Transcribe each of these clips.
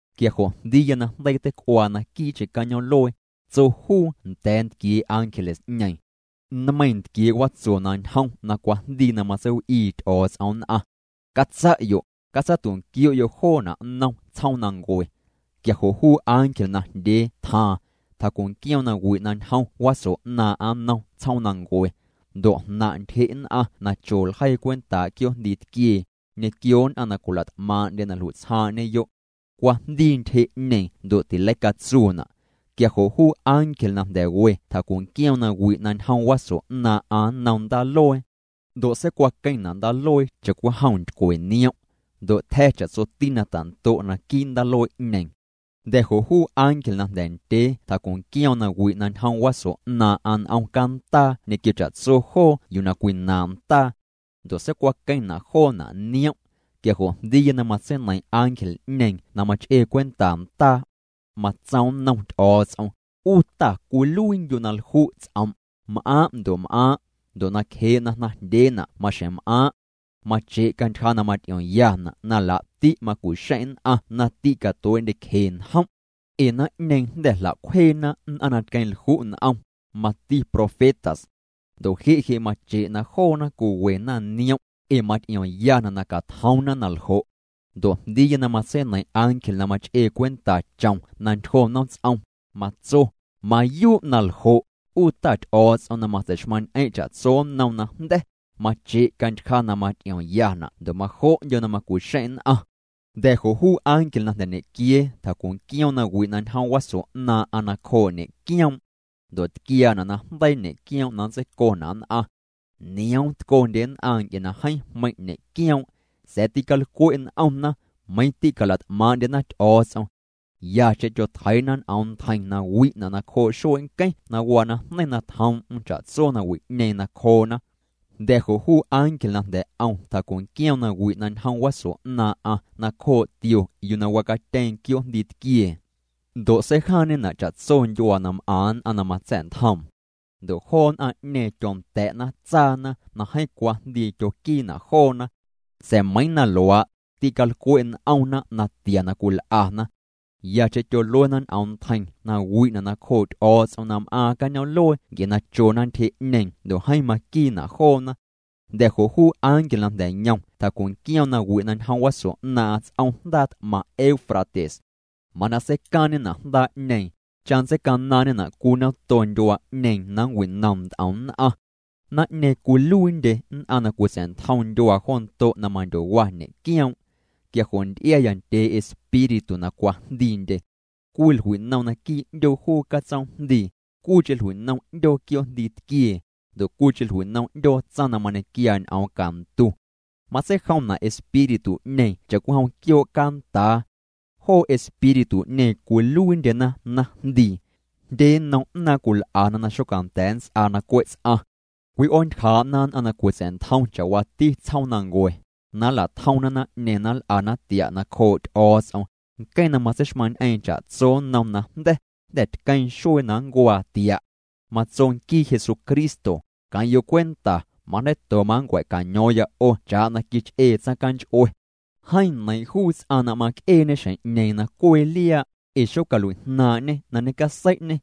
Quia jo' jndiiya najndeii teic'uaa naquii'cheⁿ cañoom'luee, tso juu nda̱a̱ ntquiee' ángeles'ñeeⁿ: —Nmeiiⁿ ntquiee' watso na ñjom na cwajndii na matseiw'ii Ty'o̱o̱ts'om nn'aⁿ. Catsa'yo', catsatu'nquio'yo' joona' nnom tsjoomnancue. Quia jo' juu ángel najndyee tjaaⁿ, tjacu'nquioom nawi' na ñjom waso 'naaⁿ'aⁿ nnom tsjoomnancue. Ndo' jnaⁿ' ntyje' nn'aⁿ na cho ljeii cwentaa' quioo'jndii tquiee, ñequio nn'aⁿ na cwila't'maaⁿ'ndye na jlui'tsjaaⁿ'ñeyo'. Cwajndii ntyje'ñeeⁿ ndo' tileicatsuuna'. Quia jo' juu ángel najnda̱ we tjacu'nquioom nawi' na ñjom waso 'naaⁿ'aⁿ nnom ndaaluee. Ndo' seicwaqueⁿna' ndaaluee cha'cwijom ntycwe niom'. Ndo' tja̱ cha'tsoti na tando' naquii' ndaaluee'ñeeⁿ. Jnda̱ jo' juu ángel na jnda̱ ndyee tjacu'nquioom nawi' na ñjom waso 'naaⁿ'aⁿ n'om candaa ñequio cha'tso joo yuu na cwinaaⁿ' ndaa. Ndo' seicwaqueⁿna' joona' niom'. Quia jo' jndiiya na matseineiⁿ ángel'ñeeⁿ na mach'ee cwenta ndaa. Matsoom nnom Ty'o̱o̱ts'om: —'U Ta cwiluiindyu' na lju' ts'om', m'aaⁿ' ndo' m'aaⁿ', ndo' nacjee' na jnaⁿjndyeena' maxjeⁿ m'aaⁿ'. Mache' cantyja na maty'iomyana' na laa'ti' macu'xeⁿ' nn'aⁿ na tîcatuee'ndyecje njom'. Ee naⁿ'ñeeⁿ jnda̱ jla'cwjeena nn'aⁿ na tqueⁿ'lju' n'om, mati profetas. Ndo' je' je' mache' na joona cwiwena niom', ee maty'iomyana' na catjoomna na ljo'. Ndo' jndiiya na matseineiⁿ ángel na mach'ee cwenta chom na ntyjo nomts'om, matso: —Mayuu' na ljo', 'U Ta Ty'o̱o̱ts'om na matsei'xmaⁿ'ñ'eⁿ' cha'tso nnom najnda̱, mache' cantyja na maty'iomyana' ndo' majo'ndyo' na macu'xeⁿ' nn'aⁿ. Jnda̱ jo' juu ángel na jnda̱ ñequiee tjacu'nquioom nawi' na ñjom waso 'naaⁿ'aⁿ nacjoo' ñe'quioom'. Ndo' tquiaana' najndeii ñe'quioom' na nntseicona' nn'aⁿ. Nioom tcondye nn'aⁿ nc'e na jeeⁿ jmeiⁿ' ñe'quioom'. Sa̱a̱ tîcalcwe' n'omna, meiⁿ tîcala't'maaⁿ'ndyena Ty'o̱o̱ts'om. Yacheⁿ tyotjeii'na ñ'oom ntjeiⁿ na wi'na' nacjoo' xuee' nqueⁿ na waa najneiⁿ na tjoom'm cha'tso nawi'ñeeⁿ nacjoona. Jnda̱ jo' juu ángel na jnda̱ 'om tjacu'nquioom nawi' na ñjom waso 'naaⁿ'aⁿ nacjoo' tio yuu na wacatyeeⁿ quioo'jndii tquiee. Ndo' seijaaⁿñena' cha'tso ndyuaa na m'aⁿ nn'aⁿ na matsa̱'ntjoom. Ndo' joo nn'aⁿ'ñeeⁿ tyonda̱'na tsaana na jeeⁿ cwajndii tyoquiina' joona. Sa̱a̱ meiⁿ na luaa', tîcalcwe' n'omna natia na cwil'ana. Yacheⁿ tyoluena ñ'oom ntjeiⁿ na wi'na' nacjoo' Ty'o̱o̱ts'om na m'aaⁿ cañoom'luee nc'e na chona ntyje'ñeeⁿ ndo' jeeⁿ maquiina' joona. Jnda̱ jo' juu ángel na jnda̱ yom tjacu'nquioom nawi' na ñjom waso 'naaⁿ'aⁿ ts'om jndaa t'maⁿ Eufrates. Mana seicaaⁿna' jndaa'ñeeⁿ, cha nntseicanaaⁿñena' cwii nato ndyuaa'ñeeⁿ na nncwinom nt'om nn'aⁿ. Naⁿ'ñeeⁿ cwiluiindye nn'aⁿ na cwitsa̱'ntjom ndyuaa jo ndo' na mandyowa ñe'quioom'. Quia jo' nty'iaya ndyee espíritu na cwajndiindye. Cwii jlui'nom naquii' 'ndyoo juu catsoomjndii, cwiicheⁿ jlui'nom 'ndyoo quioo'jndii tquiee, ndo' cwiicheⁿ jlui'nom 'ndyoo tsaⁿ na mañequiaa ñ'oom cantu. Matseijomna' espíritu'ñeeⁿ cha'cwijom quioo' candaa. Joo espíritu'ñeeⁿ cwiluiindyena naⁿjndii. Jndye nnom 'naaⁿ cwil'ana na xocanda̱a̱ nnts'aa na cwe' ts'aⁿ. Cwi'oontyjaa'na nn'aⁿ na cwitsa̱'ntjom cha'waati tsjoomnancue, na nla'tjomna naⁿ'ñeeⁿ na nl'ana tia' nacjoo' Ty'o̱o̱ts'om, nqueⁿ na matseixmaⁿñ'eeⁿ cha'tso nnom najnda̱, jnda̱ tqueⁿ xuee na nncuaa tia'. Matso nquii Jesucristo: “Queⁿ'yo' cwenta, majndeiito manncua̱caño̱o̱ⁿya 'o cha'na quich'ee tsaⁿcanch'ue. Jeeⁿ neiiⁿ' juu ts'aⁿ na m'aaⁿc'eeñe xjeⁿ'ñeeⁿ na cwee liaa', ee xocalui'jnaaⁿ'ñê na ñecasei'ñê.”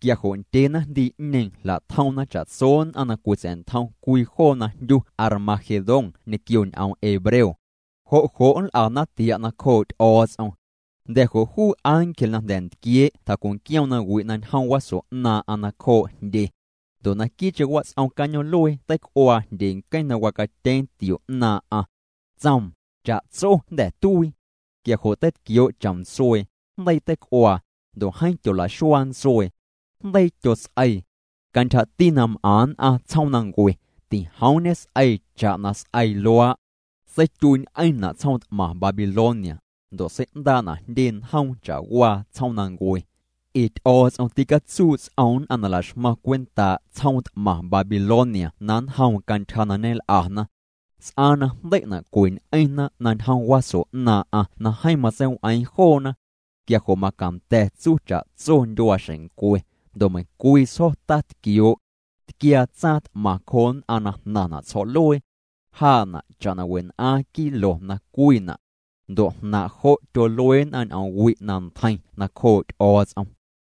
Quia jo' ndyee naⁿjndii'ñeeⁿ jla'tjomna cha'tso nn'aⁿ na cwitsa̱'ntjom cwii joo yuu na jndyu Armagedón ñequio ñ'oom hebreo. Jo' jo' nl'ana tia' nacjoo' Ty'o̱o̱ts'om. Jnda̱ jo' juu ángel na jnda̱ ntquiee' tjacu'nquioom nawi' na ñjom waso 'naaⁿ'aⁿ nacjoo' jndye. Ndo' naquii'cheⁿ wats'om cañoom'luee teic'uaa jndyee' nqueⁿ na wacatyeeⁿ tio 'naaⁿ'aⁿ. Tsoom: —Cha'tso jnda̱ tuii. Quia jo' teitquioo' chom ntsuee, jndeii teic'uaa, ndo' jeeⁿ tyola'xuaa ntsuee. Jndeii tyots'eii. Cantyjati na m'aⁿ nn'aⁿ tsjoomnancue, tijoom ñes'eii cha'na s'eii luaa'. Seityuii'ñ'eⁿna' tsjoom t'maⁿ Babilonia, ndo' sei'ndaa'na' jndye njoom cha'waa tsjoomnancue. Ee Ty'o̱o̱ts'om ticatsuu' ts'oom nn'aⁿ na la'xmaⁿ cwentaa' tsjoom t'maⁿ Babilonia na nnjoom cantyja na ñel'ana. S'aaⁿ na jndei'na' cweñ'eⁿna na ñjom waso 'naaⁿ'aⁿ na jeeⁿ matseiw'eeⁿ joona. Quia jo' macanda̱ tsuu cha'tso ndyuaaxeⁿncwe, ndo' meiⁿ cwii sjo̱ tatquioo'. Tquiaa tsaaⁿ t'maⁿ cjoo nn'aⁿ na jnaⁿna' tsjo̱'luee. Jaa'na' cha'na wen'aaⁿ kilos na cwiina'. Ndo' jnaaⁿ' jo' tyolue nn'aⁿ ñ'oom wi' na ntjeiⁿ nacjoo' Ty'o̱o̱ts'om.